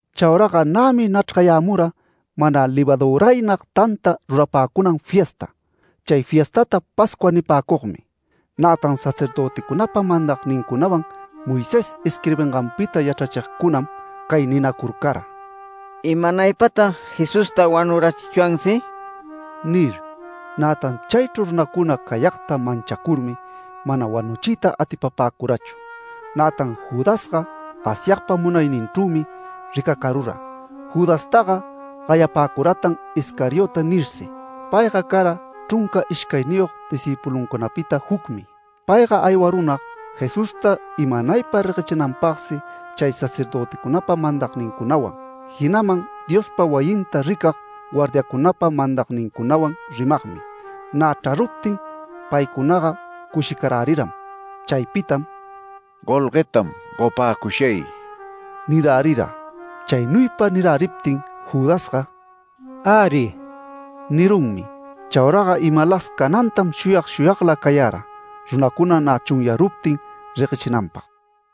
Chauraga nämi nachrgayämura mana levaduraynag tanta rurapäcunan fiesta. Chay fiestata Pascua nipäcugmi. Nätan sacerdöticunapa mandagnincunawan, Moisés isquirbinganpita yachrachigcunam cay ninacurcara: “¿Imanaypatag Jesusta wanurachichwansi?” nir. Nätan chaychru runacuna cayagta manchacurmi mana wanuchiyta atipapäcurachu. Nätan Judasga Asyagpa munayninchrümi ricacarura, Judastaga gayapäcuratan Iscariote nirsi. Payga cara chrunca ishcayniyog discïpuluncunapita jucmi. Payga aywarunag Jesusta imanaypa reguechinanpagsi chay sacerdöticunapa mandagnincunawan, jinaman Diospa wayinta ricag guardiacunapa mandagnincunawan rimagmi. Nä chraruptin paycunaga cushicaräriram. Chaypitam “Golguetam gopäcushay” nirärira. Chaynuypa niräriptin Judasga “Äri” nirunmi. Chauraga imalas canantam shuyag shuyagla cayara, runacuna nä chunyaruptin reguechinanpag.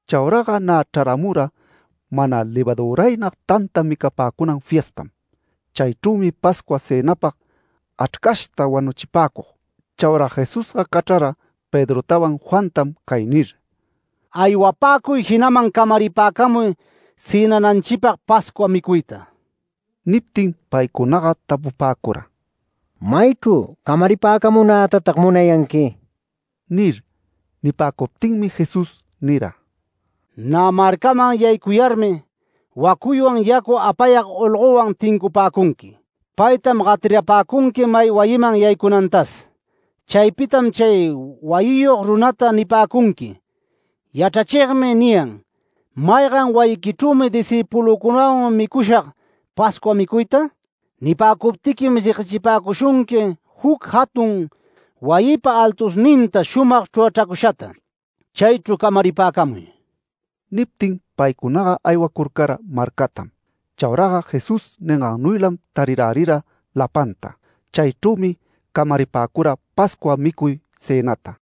Chauraga nä chraramura mana levaduraynag tanta micapäcunan fiestam. Chaychrümi Pascua cënapag achrcashta wanuchipäcug. Chaura Jesusga cachrara Pedrotawan Juantam cay nir: “Aywapäcuy jinaman camaripäcamuy cënananchipag Pascua micuyta”. Niptin paycunaga tapupäcura: “¿Maychru camaripäcamunätatag munayanqui?” nir. Nipäcuptinmi Jesús nira: “Nä marcaman yaycurcayarmi, wacuywan yacu apayag olgowan tincupäcunqui. Paytam gatirapäcunqui may wayiman yaycunantas. Chaypitam chay wayiyog runata nipäcunqui: ‘Yachrachigmi niyan ¿maygan wayiquichrümi discïpulücunawan micushag Pascua micuyta?’ Nipäcuptiquim, reguechipäcushunqui juc jatun wayipa altusninta shumag chrurachracushata. Chaychru camaripäcamuy”. Niptin paycuna aywacurcara marcatam. Chauraga Jesús ningannuylam tarirärira lapanta. Chaychrümi camaripäcura Pascua micuy cënata.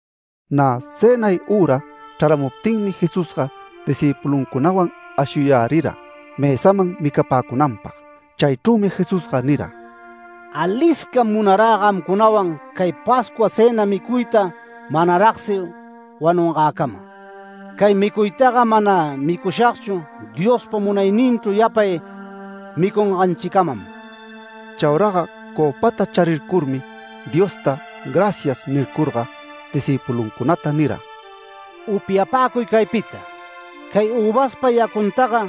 Nä cënay üra chraramuptinmi Jesusga discïpuluncunawan ashuyarärira mësaman micapäcunanpag. Chaychrümi Jesusga nira: “Aliscam munarä gamcunawan cay Pascua cëna micuyta manaragsi wanungäcama. Cay micuytaga mana micushagchu Diospa munayninchru yapay micunganchicamam”. Chauraga cöpata charircurmi, Diosta “Gracias” nicurcurga discïpuluncunata nira: “Upyapäcuy caypita. Cay üvaspa yacuntaga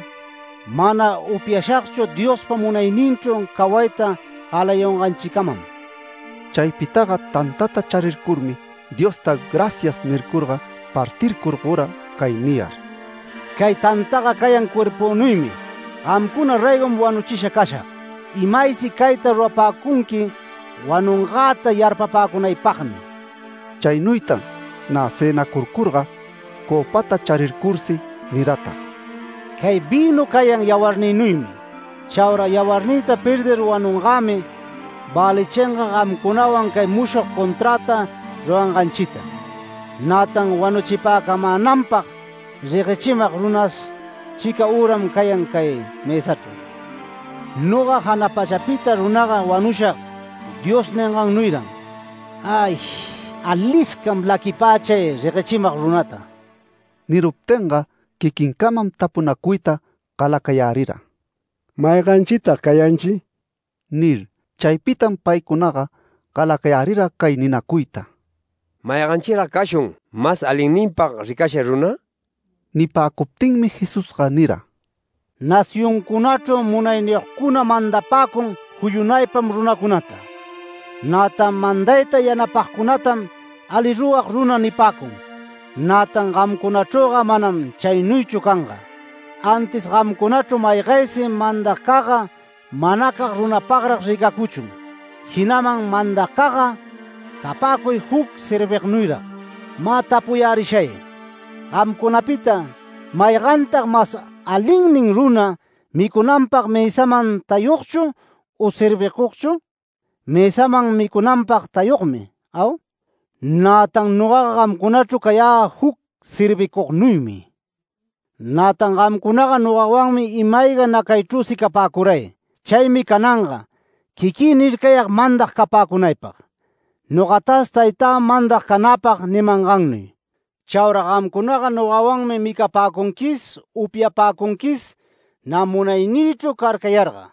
mana upyashagchu Diospa munayninchru cawayta galayunganchicamam”. Chaypitaga tantata charicurcurmi, Diosta “Gracias” nicurga, partircur gora cay niyar: “Cay tantaga cayan cuerpünuymi gamcuna raygom wanuchisha cashag. Imaysi cayta rurapäcunqui wanungäta yarpapäcunaypagmi”. Chaynuytan nä cënacurcurga cöpata charircursi niratag: “Cay vïnu cayan yawarnïnuymi. Chaura yawarnïta perdir wanungämi välichinga gamcunawan cay mushog conträta ruranganchita. Nätan wanuchipäcamänanpag reguechimag runas, chica üram cayan cay mësachru. Noga jana pachapita runaga wanushag Dios ningannuyran. ¡Ay! Aliscam laquipä chay reguechimag runata”. Niruptinga quiquincamam tapunacuyta galacayärira: “¿Mayganchitag cayanchi?” nir. Chaypitam paycunaga galacayärira cay ninacuyta: “¿Mayganchirag cashun mas alinninpag ricasha runa?” Nipäcuptinmi Jesusga nira: “Nacioncunachru munayniyogcuna mandapäcun juyunaypam runacunata, nätan mandayta yanapagcunatam ali rurag runa nipäcun. Nätan gamcunachrüga manam chaynuychu canga. Antis gamcunachru maygaysi mandagcagga manacag runapagrag ricacuchun, jinaman mandagcagga capäcuy juc servignuyrag. Mä tapuyärishay: Gamcunapita, ¿maygantag mas alinnin runa, micunanpag mësaman tayugchu u servicugchu? Mësaman micunanpag tayugmi, ¿au? Nätan nogaga gamcunachru cayä juc servicugnuymi. Nätan gamcunaga nogawanmi ima-ayga nacaychrüsi capäcuray. Chaymi cananga quiquï nircayag mandag capäcunaypag, nogatas Taytä mandag canäpag nimangannuy. Chaura gamcunaga, nogawanmi micapäcunquis upyapäcunquis nä munaynïchru carcayarga,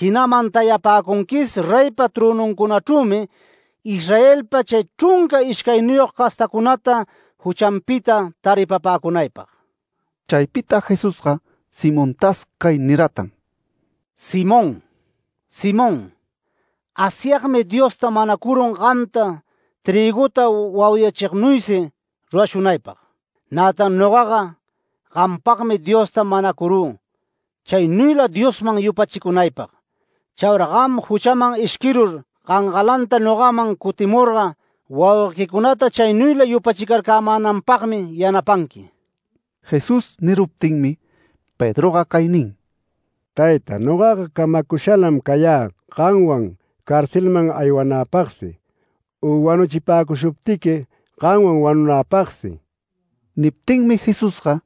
jinaman tayapäcunquis reypa trönuncunachrümi Israelpa chay chrunca ishcayniyog castacunata juchanpita taripapäcunaypag”. Chaypita Jesusga Simontas cay niratan: “Simón, Simón, Asyagmi Diosta manacurun gamta trïguta wauyachignuysi rurashunaypag. Nätan nogaga gampagmi Diosta manacurü chaynuyla Diosman yupachicunaypag. Chaura gam juchaman ishquirur gangalanta nogaman cutimurga wauguequicunata chaynuyla yupachicarcämänanpagmi yanapanqui”. Jesús niruptinmi Pedroga cay nin: “Tayta, nogaga camacushalam cayä gamwan carcelman aywanäpagsi u wanuchipäcushuptiqui gamwan wanunäpagsi”. Niptinmi Jesusga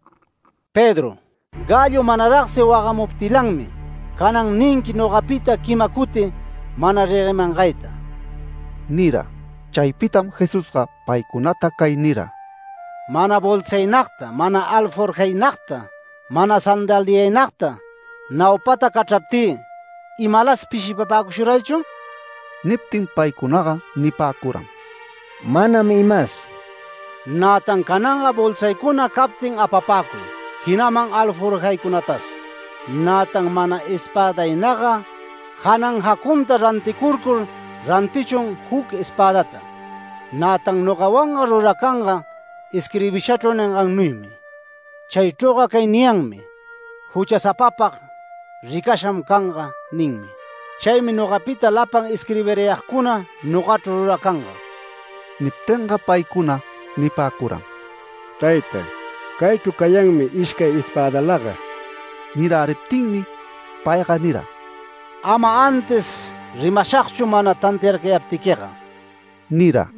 “Pedro, gallo manaragsi wagamuptilanmi, canan ninqui nogapita quima cuti mana reguemangayta” nira. Chaypitam Jesusga paycunata cay nira: “Mana bolsaynagta, mana alforjaynagta, mana sandaliaynagta, naupata cachraptï ¿imalas pishipapäcushuraychu?” Niptin paycunaga nipäcuram: “Manam imas”. “Nätan cananga bolsaycuna captin apapäcuy, jinaman alforjaycunatas. Nätan mana espädaynagga janan jacunta ranticurcur rantichun juc espädata. Nätan nogawanga ruracanga isquirbishachru ningannuymi. Chaychrüga cay niyanmi ‘Juchasapapag ricasham canga’ ninmi. Chaymi nogapita lapan isquirbirayagcuna nogachru ruracanga”. Niptinga paycuna nipäcuram: “Tayta, caychru cayanmi ishcay espädalaga”. Niräriptinmi payga nira: “Ama antis rimashagchu mana tantiarcayämaptiquiga” nira.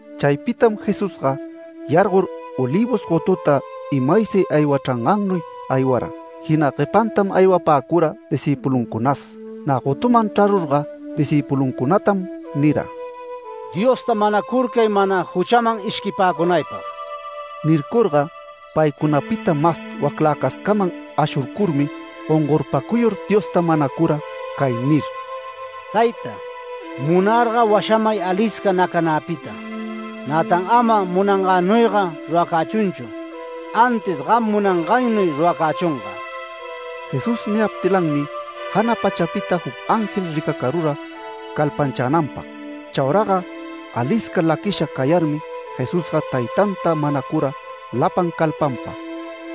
Chaypitam Jesusga yargor Olivos gotuta imaysi aywachrangannuy aywara, jina guepantam aywapäcura discïpuluncunatas. Nä gotuman chrarurga discïpuluncunatam nira: “Diosta manacurcay mana juchaman ishquipäcunaypag”. Nircurga paycunapita mas wacläcascaman ashurcurmi gongorpacuyur Diosta manacura cay nir: “Tayta, munarga washamay alisca nacanäpita. Nätan ama munangänuyga ruracächunchu, antis gam munangaynuy ruracächunga”. [Jesús niyaptilanmi jana pachapita juc ángel ricacarura calpanchänanpag. Chauraga alisca laquisha cayarmi, Jesusga Taytanta manacura lapan calpanpa,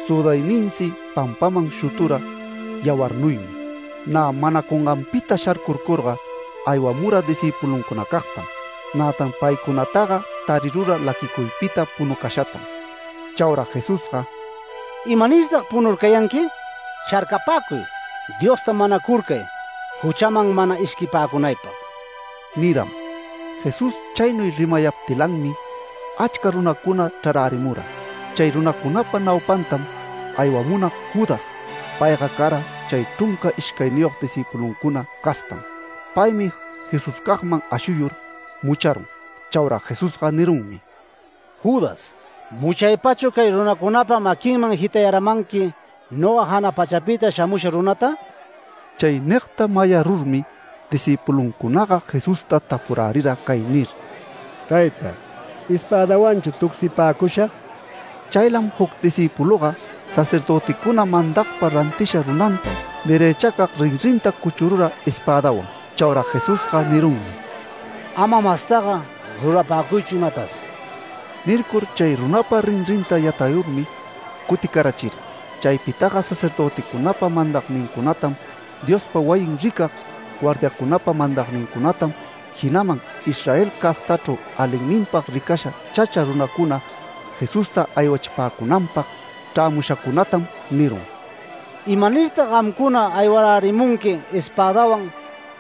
südayninsi pampaman shutura yawarnuymi.] Nä manacunganpita sharcurcurga, aymura discïpuluncunacagtam. Nätan paycunataga tarirura laquicuypita punucashatam. Chaura Jesusga “¿Imanirtag punurcayanqui? Sharcapäcuy, Diosta manacurcay, juchaman mana ishquipäcunaypag” niram. Jesús chaynuy rimayaptilanmi achca runacuna chrarärimura. Chay runacunapa naupantam aywamunag Judas. Payga cara chay chrunca ishcayniyog discïpuluncuna castam. Paymi Jesuscagman ashuyur mucharun. Chaura Jesusga nirunmi: “Judas, ¿muchaypachu cay runacunapa maquinman jitarayämanqui, noga jana pachapita shamusha runata?” Chay nigta mayarurmi discïpulucunaga Jesusta tapurärira cay nir: “Tayta, ¿espädawanchu tucsipäcushag?” Chaylam juc discïpuluga sacerdöticuna mandagpa rantisha runanta derëchacag rinrinta cuchurura espädawan. Chaura Jesusga nirunmi: “¡Ama mastaga rurapäcuychu imatas!” Nircur chay runapa rinrinta yatayurmi, cuticarachira. Chaypitaga sacerdöticunapa mandagnincunatam, Diospa wayin ricag guardiacunapa mandagnincunatam, jinaman Israel castachru alinninpag ricasha chacha runacuna Jesusta aywachipäcunanpag chrämushacunatam nirun: “¿Imanirtag gamcuna aywarärimunqui espädawan,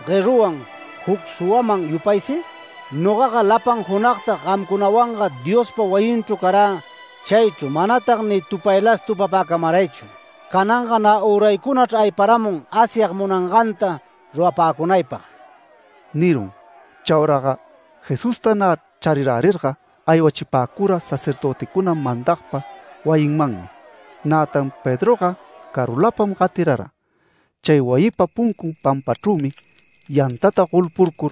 gueruwan, juc suwaman yupaysi? Nogaga lapan junagtag gamcunawanga Diospa wayinchru carä chaychru manatag ni tupaylas tupapäcamaraychu. Cananga nä üraycunachr ayparamun Asyag munanganta rurapäcunaypag” nirun. Chauraga Jesusta nä charirärirga, aywachipäcura sacerdöticuna mandagpa wayinmanmi, nätan Pedroga carulapam gatirara. Chay wayipa puncun pampachrümi yantata golpurcur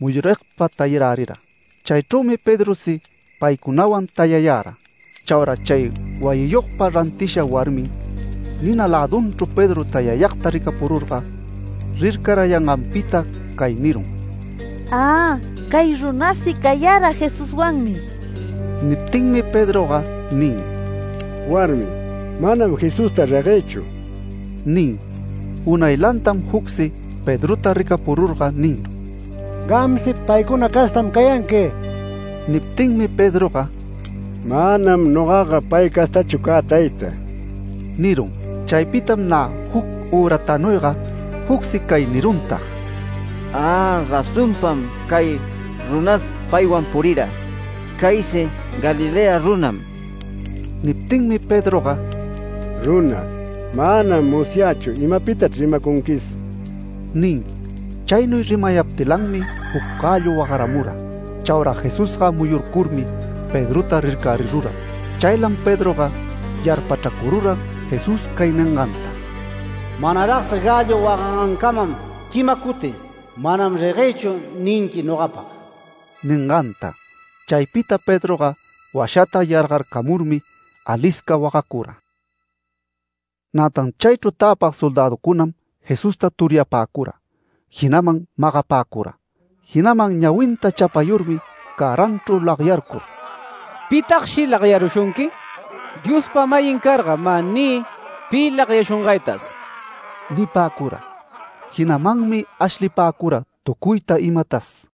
muyurigpa tayarärira. Chaychrümi Pedrosi paycunawan tayayara. Chaura chay wayiyogpa rantishan warmim nina lädunchru Pedro tayayagta ricapururga, rircarayanganpita cay nirun: “¡Ä! ¡Cay runasi cayara Jesuswanmi!” Niptinmi Pedroga nin: “Warmi, manam Jesusta reguëchu” nin. Unaylantam jucsi Pedrota ricapururga nirun: “¡Gamsi paycuna castam cayanqui!” Niptinmi Pedroga “¡Manam nogaga pay castachu cä tayta!” nirun. Chaypitam nä juc üratanuyga, jucsi cay niruntag: “Ä, razonpam cay runas paywan purira. Caysi Galilea runam”. Niptinmi Pedroga “Runa, manam musyächu imapitachr rimacunquisi” nin. Chaynuy rimayaptilanmi juc gallo wagaramura. Chaura Jesusga muyurcurmi Pedrota rircarirura. Chaylam Pedroga yarpachracurura Jesús cay ninganta: “Manaragsi gallo wagangancamam quima cuti ‘Manam reguegchu’ ninqui nogapag” ninganta. Chaypita Pedroga washata yargarcamurmi alisca wagacura. Nätan chaychru täpag soldäducunam Jesusta turyapäcura, jinaman magapäcura. Jinaman ñawinta chapayurmi cäranchru lagyarcur “¿Pitagshi lagyarushunqui? Diospa-mayin carga mä niy pi lagyashungaytas” nipäcura. Jinamanmi ashlipäcura tucuyta imatas.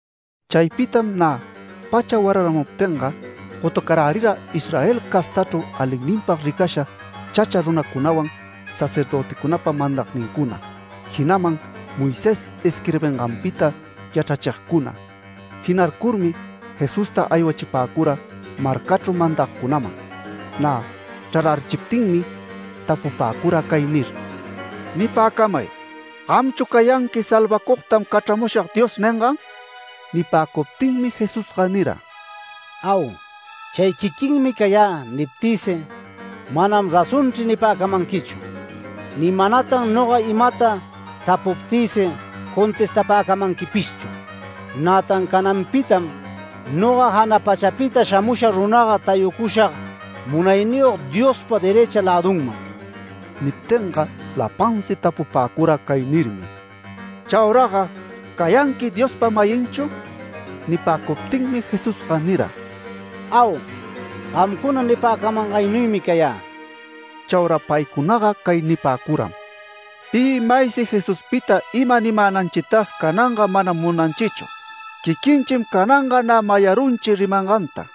Chaypitam nä pacha wararamuptinga gotucarärira Israel castachru alinninpag ricasha chacha runacunawan sacerdöticunapa mandagnincuna, jinaman Moisés isquirbinganpita yachrachigcuna. Jinarcurmi Jesusta aywachipäcura marcachru mandagcunaman. Nä chrarärichiptinmi, tapupäcura cay nir: “Nipäcamay, ¿gamchu cayanqui ‘Salvacugtam cachramushag’ Dios ningan?” Nipäcuptinmi Jesusga nira: “ ‘Au, chay quiquinmi cayä’ niptïsi, ‘Manam razonchri’ nipäcamanquichu. Ni manatan noga imata tapucuptïsi contestapäcamanquipishchu. Nätan cananpitam noga jana pachapita shamusha runaga tayucushag Munayniyog Diospa derëcha lädunman”. Niptinga lapansi tapupäcura cay nirmi: “Chauraga ¿cayanqui Diospa-mayinchu?” Nipäcuptinmi Jesusga nira: “Au, gamcuna nipäcamangaynuymi cayä”. Chaura paycunaga cay nipäcuram: “Pi maysi Jesuspita ima nimänanchitas cananga manam munanchichu. Quiquinchim cananga nä mayarunchi rimanganta”.